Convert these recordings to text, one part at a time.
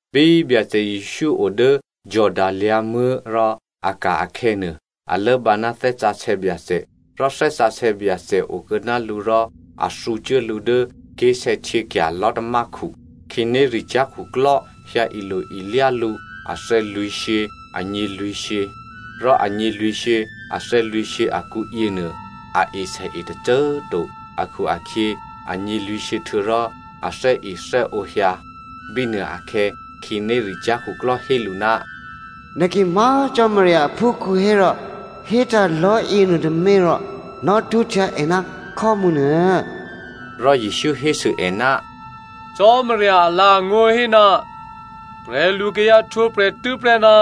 Bí Byacè Jesǔ o dố Jordano lyǎ̤muố̤ rò a ka̤ akhè̌nuô, a lốbǎ ná Thè́ Sǎsè̌ Byacè. Rò Thè́ Sǎsè̌ Byacè okuô̌ ná lǔ rò a thǔcuố lǔ dố ké̤sè̌htyěkya̤ lò̤́tamákhu. Khǐnéricyá̤ khuklò́ hyǎ ilo-ilyá lǔ athè̌lwǐ̤shyě anyělwǐ̤shyě. Rò anyělwǐ̤shyě athè̌lwǐ̤shyě akǔyěnuô a esèe tôcô꤮ to akhu-akhyě anyělwǐ̤shyě htuô̌rò athè́ethè́ǒ hyǎ. Bínuôakhè̌ khǐnéricyá̤ khuklò́ hé lǔ, “Nè̤ ki má̤ Cò́marya aphúkhǔ hérò hétǎ̤ lò̤́ yěnuôtômě rò nò̌htwǒhtya è ná khò́mǔ nuô.” Rò Jesǔ hésû è, “Cò́marya alǎ̤angó̤ hé, ‘Prè̤lukayǎ htwǒprè̤ tû́prè́ ná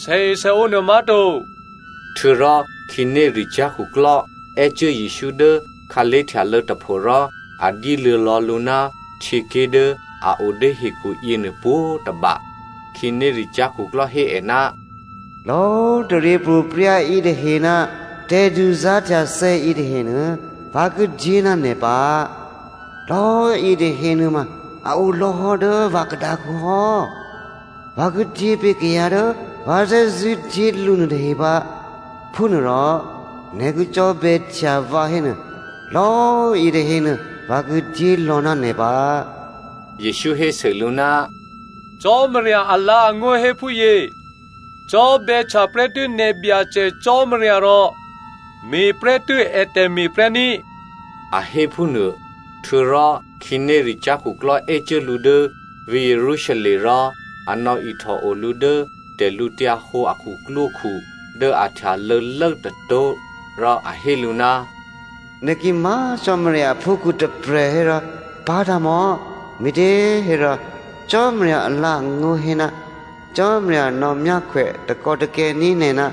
sèesèǒ nuô má̤to.’” Htuô̌rò khǐnéricyá̤ khuklò́ è́cuố Jesǔ dố khǎlé̤htyalô̌ tôpho rò a dyéluô̌ lò̌ lǔ ná htyěké̤ dố a o dố hekhu yěnuô pwǒ̤tôba. Khǐnéricyá̤ khuklò́ hé è, “Lò̌꤮ taryěpro̤prya̤ yětahe ná tè̤duzá̤htyathè̌ yětahenuô, vǎ ki dyé ná nè̤ pǎ. Lò̌꤮ yětahe nuôma a o lò̌hò́ dố vǎ khadǎkǔ hò́, vǎ ki dyépé̤ kayǎ dố vǎ thè́zṳ̂́ dyé lǔ nuôtahe pǎ. Phúnuôrò nè̤ ki cò́bè̌htya vǎ hénuô, lò̌꤮ yětahenuô vǎ ki dyé lò̌ ná nè̤ pǎ.” Jesǔ hésû lǔ, “Cò́marya alǎ̤angó̤ hé phúyě, ‘Cò́bè̌htya prè́tû́ nè̤ Byacè Cò́marya rò me̤prè́tû́ ètè̤me̤ prè́ ní,’” a hé phúnuô. Htuô̌rò khǐnéricyá̤ khuklò́ è́cuố lǔ dố vǐ̤ Jerusalem rò a nò̌ihtòo lǔ dố tè̤lǔhǒdu a khuklwókhu dố a htyalô̌lố tôtó̤ rò a hé lǔ, “Nè̤ ki má̤ Cò́marya aphúkhǔ tôprè̤ hérò pá̤tǎ̤ mò̌! Me̤těhérò, Cò́marya alǎ̤angó̤ hé, ‘Cò́marya nò̌ myákhwè takò́takè̤ní̤ nè̤ ná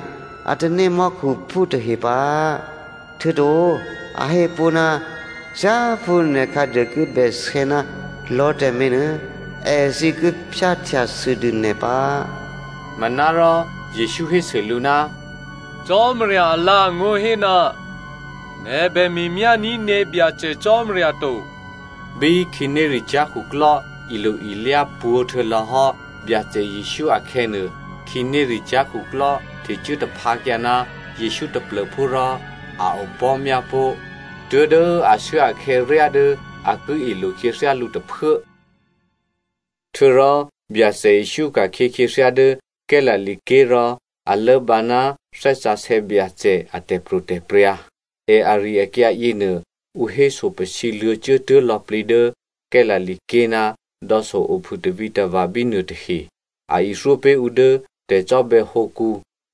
a tanémò́khuphú tahe pǎ.’ “Htuô̌to a hé pó̤, ‘Thyáphú nè̤ khǎduô ki bèsè̌ ná lò̤́ tǎmé̤ nuô èthǐ ki phyáhtyasûdû nè̤ pǎ.’” Manárò Jesǔ hésû lǔ, “Cò́marya alǎ̤angó̤ hé, ‘Nè̤ bè me̤myání̤ nè̤ Byacè Cò́marya to.’” Bí khǐnéricyá̤ khuklò́ ilo-ilyá pwǒ̤ htuô̌lò̌ hò́ Byacè Jesǔ akhè̌nuô, khǐnéricyá̤ khuklò́ htecuố taphǎkyǎ ná Jesǔ taplô̤phú rò a opò̤́myá pó̤ tuố̤dố ashuốakhè̌ ryá dố a ki ilo khyěthyá lǔ tôphuố. Htuô̌rò Byacè Jesǔ ka̤khyě khyěthyá dố Galilea ké̤ rò a lốbǎ ná Thè́ Sǎsè̌ Byacè a tè̤pro̤tè̤prya̤. È ari-akyǎ yěnuô ǔ héso pasǐ luô̌cuốtuố̤ lò̌plǐ dố Galilea ké̤ ná dò̌so ophû tavǐtava̤ bínuô tahe. A ithyó pé̤ ǔ dố tè̤cò́bè̌hǒkǔ,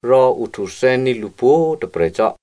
rò ǔ htuthè́ní̤ lǔ pwǒ̤꤮ tôprè̤ cò́.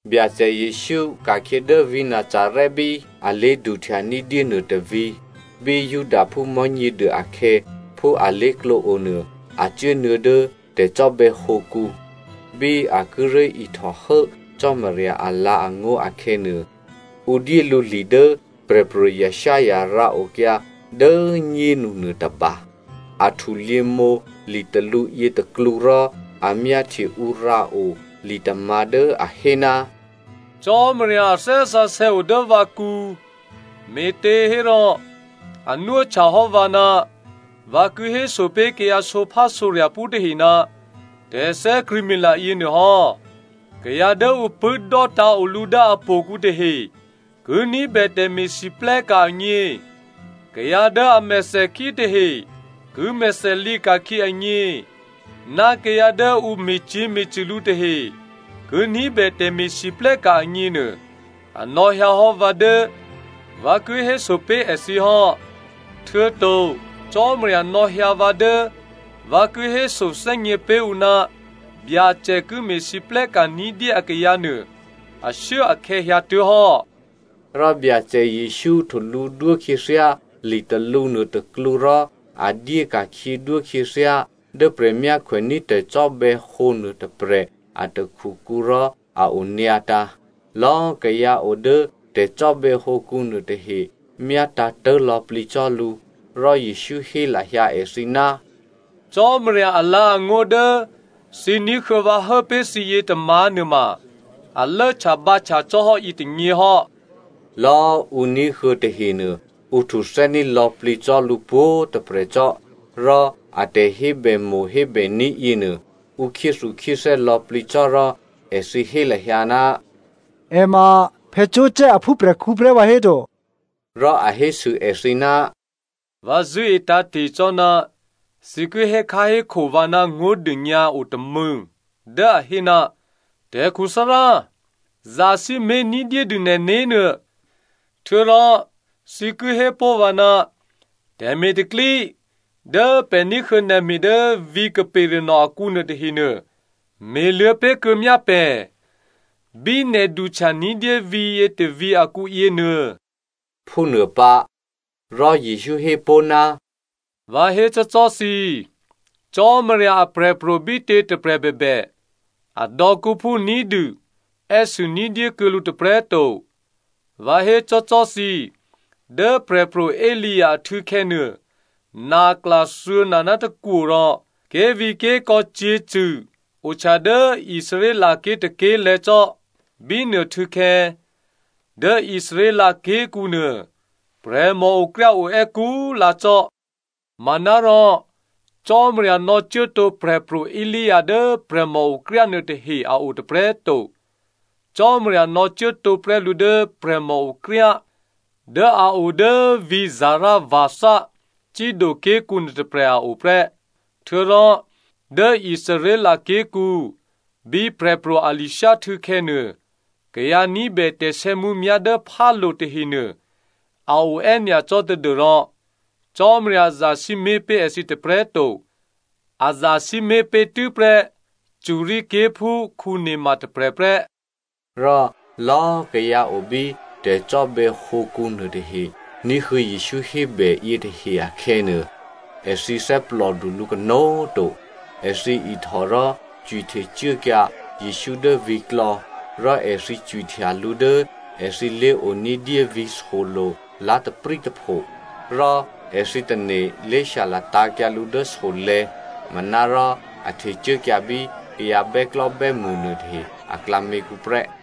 Byacè Jesǔ ka̤khyě dố vǐ̤ Nazarè bí a lé̤duhtya ní̤dyé nuôtôvǐ̤. Bí Judaphú Mò̤́nyěduô akhè̌, phú alé̤klǒ onuô, a cuốnuô̌ dố tè̤cò́bè̌hǒkǔ. Bí a kíré̤ ihtòhố Cò́marya alǎ̤angó̤ akhè̌nuô, ǔ dyé lǔ li dố Prè̤pro̤ Isaiah rǎokyǎ dố꤮ nyénu nuôtôba. A htulyěmǒ litalǔ yětôklǔ rò a myáhtye ǔ rǎo li tômǎ̤ dố a hé, “Cò́marya Thè́ Sǎsè̌ o dố vǎkǔ, me̤těhérò a nwóhtya hò́ vǎ ná vǎ ki héso pé̤ kayǎ sǒphásǒrya̤phú tahe ná tè̤thè́krṳ̂̌mila yěnuô hò́. Kayǎ dố ǔ pṳ̂́ dò́tǎ̤ o lǔ dố htò̌kǔ tahe ki ní̤bè tè̤me̤lwóhteka̤ agně, kayǎ dố a mèthèkhí tahe ki mèthèlǐ ka̤khyě agně, ná kayǎ dố ǔ me̤cyě̤me̤cṳ̂ lǔ tahe ki ní̤bè tè̤me̤lwóhteka̤ agněnuô a nò̌hyǎ hò́ vǎ dố vǎ ki héso pé̤ èthǐ hò́. Htuô̌to Cò́marya nò̌hyǎ vǎ dố vǎ ki hésothè́gně pé̤ ǔ ná Byacè ki me̤lwóhteka̤ ní̤dyé akayǎ nuô ashuốakhè̌ hyǎtuố̤hò́.” Rò Byacè Jesǔ htulǔdwó khyěthyá litalǔ nuôtôklǔ rò a dyéka̤khyědwó khyěthyá dố prè̤myákhwèní̤ tè̤cò́bè̌hǒ nuôtôprè̤ a takhukǔ rò a onyǎtǎ̤. Lò̌꤮ kayǎ o dố tè̤cò́bè̌hǒkǔ nuôtahe myátǎ̤tố̤ lò̌plǐ cò́ lǔ. Rò Jesǔ hé lahyǎ èthǐ, “Cò́marya alǎ̤angó̤ dố thǐ ní̤huô̌ vǎ hố pé̤ thǐ yětômǎ̤ nuôma a lốhtyabǎhtya cò́ hò́ yětônyě hò́.” Lò̌꤮ ǔ ní̤huô̌ tahenuô, ǔ htuthè́ní̤ lò̌plǐ cò́ lǔ pwǒ̤꤮ tôprè̤ cò́, rò a tè̤hébèmo̤ hébèní̤ yěnuô, ǔ khyéthukhyéthè́ lò̌plǐ cò́ rò èthǐ hé lahyǎ, “È ma Joseph aphúprè̤khǔ prè́ vǎhéto?” Rò a hésû èthǐ, “Vǎ zṳ̂́e tǎ̤te̤ cò́ ná thǐ ki hékháhékho vǎ ná ngó̤dônyǎ otômû̌ dố a hé, ‘Tè̤khuthárá꤮ zasǐmé̤ ní̤dyédû nè̤né̤ nuô.’ Htuô̌rò thǐ ki hépó̤ vǎ, ‘Tè̤me̤ tè̤pro̤tè̤prya̤ dố pè̤ ní̤huô̌ nè̤ me̤ dố vǐ̤ Capernaum akǔ nuôtahenuô, me̤luô̌ pé̤kuô̌ myá pè̤ bí nè̤ duhtya ní̤dyé vǐ̤yě tôvǐ̤ akǔyě nuô̌꤮’” phúnuô pǎ. Rò Jesǔ hé pó̤, “Vǎ hécò́cò́ thǐ꤮, Cò́marya aprè̤pro̤ bítě꤮ tôprè̤ bèbè, adò̌kǔphú ní̤dû è́sû ní̤dyékuô̌ lǔ tôprè̤꤮ to. Vǎ hécò́cò́ thǐ꤮ dố Prè̤pro̤ Elia ahtû̌khè̌ nuô, nakla thuô̌na ná tôkwo rò ké̤vǐ̤ké̤kò̌ cyě̤cṳ̂ ohtya dố Israelké̤ tôké̤lè̤̌ cò́. Bínuô htû̌khè̌, dố Israel ké̤kǔ nuô, prè̤mòokryá oè́ kú꤮ lǎ cò́. Manárò Cò́marya nò̌cuố tǒ Prè̤pro̤ Elia dố prè̤mòokryá nuôtahe a o tôprè̤꤮ to. Cò́marya nò̌cuố tǒ prè́ lǔ dố prè̤mòokryá dố a o dố vǐ̤ Zarepha, Sidoké̤kǔ nuôtôprè̤ a o prè́. Htuô̌rò, dố Israel ké̤kǔ, bí Prè̤pro̤ Elizeo htû̌khè̌nuô kayǎ ní̤bè tè̤sè̌mǔmyá̤ dố phálo̤ tahenuô a o è́nyacò́ tadû́rò Cò́marya zasǐmé̤ pé̤ èthǐ tôprè̤꤮ to, a zasǐmé̤ pé̤ tû́prè́ Syria ké̤phú Naama tôprè̤ prè́.” Rò lò̌꤮ kayǎ o bí tè̤cò́bè̌hǒkǔ nuôtahe ní̤huô̌ Jesǔ hébè yětahe akhè̌nuô, èthǐ thè́plòdu lǔ kanó̤꤮ to. Èthǐ ihtò rò cwihtecuốkyǎ Jesǔ dố vǐ̤klò̌, rò èthǐ cwihtya lǔ dố èthǐ lé̤oní̤dyé vǐ̤ solo̤ lá̤taprǐ tôpho. Rò èthǐ tane̤ lě shyalatǎ̤kyǎ lǔ dố solè̤̌, manárò a htecuốkyǎ bí kayǎ bè́klò́bè́mṳ nuôtahe aklǎměkǔ prè́.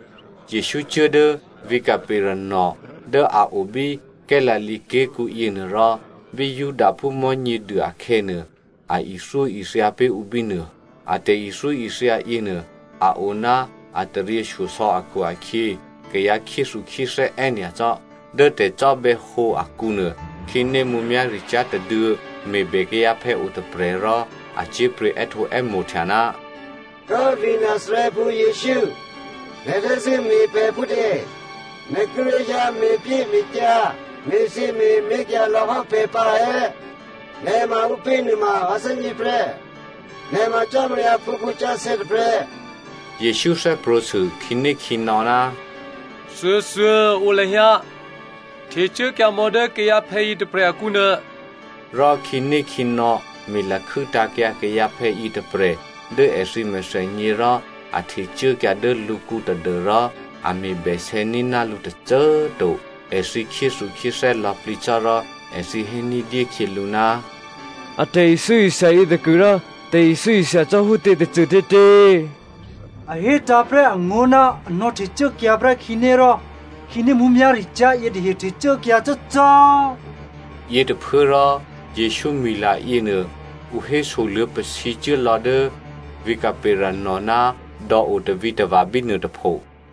Jesǔ cuố dố vǐ̤ Capernaum dố a o bí Galilea ké̤kǔ yěnuô rò bí Judaphú Mò̤́nyěduô akhè̌nuô, a ithyóithya pé̤ ǔ bínuô. A tè̤ithyóithya yěnuô a o ná a taryěshyosò̌ akhu-akhyě, kayǎ khyéthukhyéthè́ è́nyacò́. Dố tè̤cò́bè̌hǒ akǔnuô, khǐné mǔmyá̤ricyá̤ tôduô̌ me̤bè kayǎphè̌ otôprè̤ rò a cyé̤pryě̤ è́htǒè́mo̤htya, “Kố꤮ vǐ̤ Nazarèphú Jesǔ꤮, nè̤ thè́zṳ̂́ me̤ pè̤ phútě? Nè̤ kíré̤ hyǎ me̤pyéme̤kyǎ me̤thyěme̤mé̤ kyǎlò̌hò́ pè̤ pǎ è̌? Nè̤ ma ǔpě nuôma vǎ thè́gně prè́, nè̤ ma Cò́marya aphúkhǔ sǎsè̌ tôprè̤.” Jesǔ thè́prwǒ̤ sû khǐnékhǐnò̌, “Thuôthuô꤮ o lahyǎ, htecuốkyǎmò̌ dố kayǎphè̌ yětôprè̤ akǔnuô.” Rò khǐnékhǐnò̌ me̤lakhû́ tǎ̤kyǎ kayǎphè̌ yětôprè̤ dố èthǐ mèthènyě rò a htecuốkyǎ dố lǔkǔ tadû́rò a me̤ bèsè̌ ní̤ná lǔ tôcô꤮ to. Èthǐ khyéthukhyéthè́ lò̌plǐ cò́ rò èthǐ hé ní̤dyé khyělǔ, “A tè̤ithyóithya yětôkuôrò tè̤ithyóithya cò́ phútě tôcôtětě? A hétǎ̤ prè́ angó̤ ná a nò̌htecuốkyǎ prè́ khǐné rò khǐné mǔmyá̤ricyá̤ yětahe htecuốkyǎ cò́cò́.” Yětôphuốrò Jesǔ mwi̤la yěnuô ǔ hésoluô̌ pasǐcuố lò̌ dố vǐ̤ Capernaum ná dò̌o tavǐtava̤ bínuô tôpho.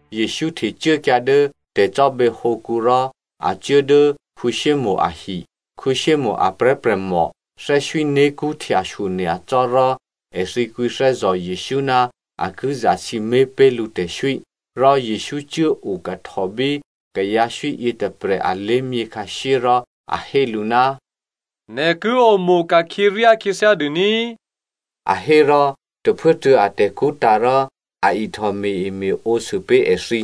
Jesǔ htecuốkyǎ dố tè̤cò́bè̌hǒkǔ rò a cuố dố Simonè ahi. Simonè a prè̤́prè̤mò thè́swíné̤kṳ́ htyashyo nyacò́ rò èthǐ kwǐthè́zò̤ Jesǔ ná a ki zasǐmé̤ pé̤ lǔ tè̤swí. Rò Jesǔ cuố okahtò bí kayǎswí yětôprè̤ alé̤myě khǎshyé rò a hé lǔ, “Nè̤ ki omo̤ ka̤khyě ryákhyěthyá dûní꤮” a hé rò tôphuốtuô̌ atè̤kṳ́ tǎ̤ rò a ihtò me̤-eme̤ǒsû pé̤ èthǐ.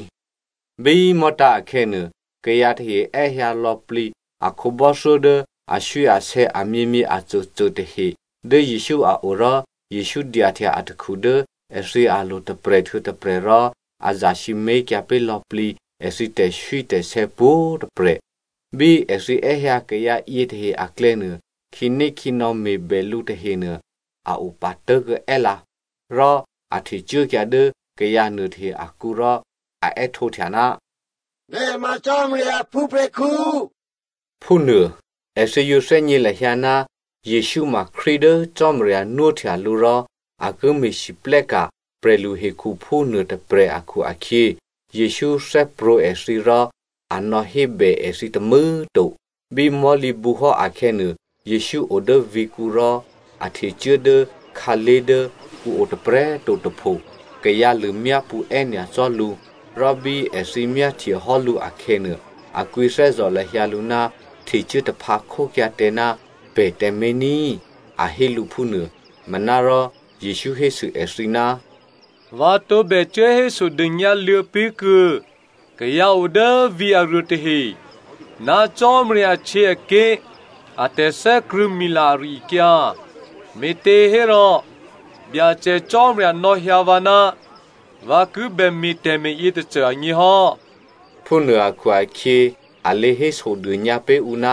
Bí mò̤́tǎ̤ akhè̌nuô, kayǎ tahe è́hyǎ lò̌plǐ a khǒbò́thyó dố aswíasè̌ amyěmyě acôcô tahe dố Jesǔ a o rò Jesǔ dyahtya atakhu dố èthǐ alo̤ tôprè̤ htuô̌ tôprè̤ rò a zasǐmé̤kyǎ pé̤ lò̌plǐ èthǐ tè̤swítè̤sè̌ pwǒ̤꤮ tôprè̤. Bí èthǐ è́hyǎ kayǎ yětahe aklè̌nuô, khǐnékhǐnò̌ me̤bè lǔ tahenuô a opatố̤ è́lǎ. Rò a htecuốkyǎ dố kayǎ nuôtahe akǔ rò a è́htǒhtya, “Nè̤ ma Cò́marya aphúprè̤khǔ” phúnuô. Èthǐ yǒ thè́gně lahyǎ ná Jesǔ ma Krístu dố Cò́marya nwóhtya lǔ rò a ki me̤lwóhteka̤ prè̤luhekhuphú nuôtôprè̤ akhu-akhyě, Jesǔ thè́prwǒ̤ èthǐ rò a nò̌hébè èthǐ tômû̌꤮ to. Bí mò̤́lǐbǔ hò́ akhè̌nuô, Jesǔ o dố vǐ̤kǔ rò a htecuố dố khǎlé̤ dố ǔ o tôprè̤꤮ to tôpho. Kayǎ lṳ̂myápṳ̌ è́nyacò́ lǔ, rò bí èthǐ myáhtye hò́ lǔ akhè̌nuô, a kwǐthè́zò̤ lahyǎ lǔ, htecuố taphǎ khókyǎ tǎ ná pè̤ tǎmé̤ ní꤮, a hé lǔ phúnuô. Manárò, Jesǔ hésû èthǐ, “Vǎ tǒbè cuố hésodônyǎ luô̌ pé̤kuô̌ kayǎ o dố vǐ̤ aruô tahe ná Cò́marya ahtyěaké̤ a tè̤thè́krṳ̂̌mila ari-akyǎ, me̤těhérò Byacè Cò́marya nò̌hyǎ vǎ ná vǎ kibè me̤ tè̤me̤ yětôcô agně hò́.” Phúnuô akhu-akhyě, a lě hésodônyǎ pé̤ ǔ ná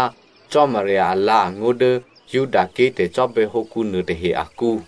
Cò́marya alǎ̤angó̤ dố Judaké̤ tè̤cò́bè̌hǒ nuôtahe akǔ.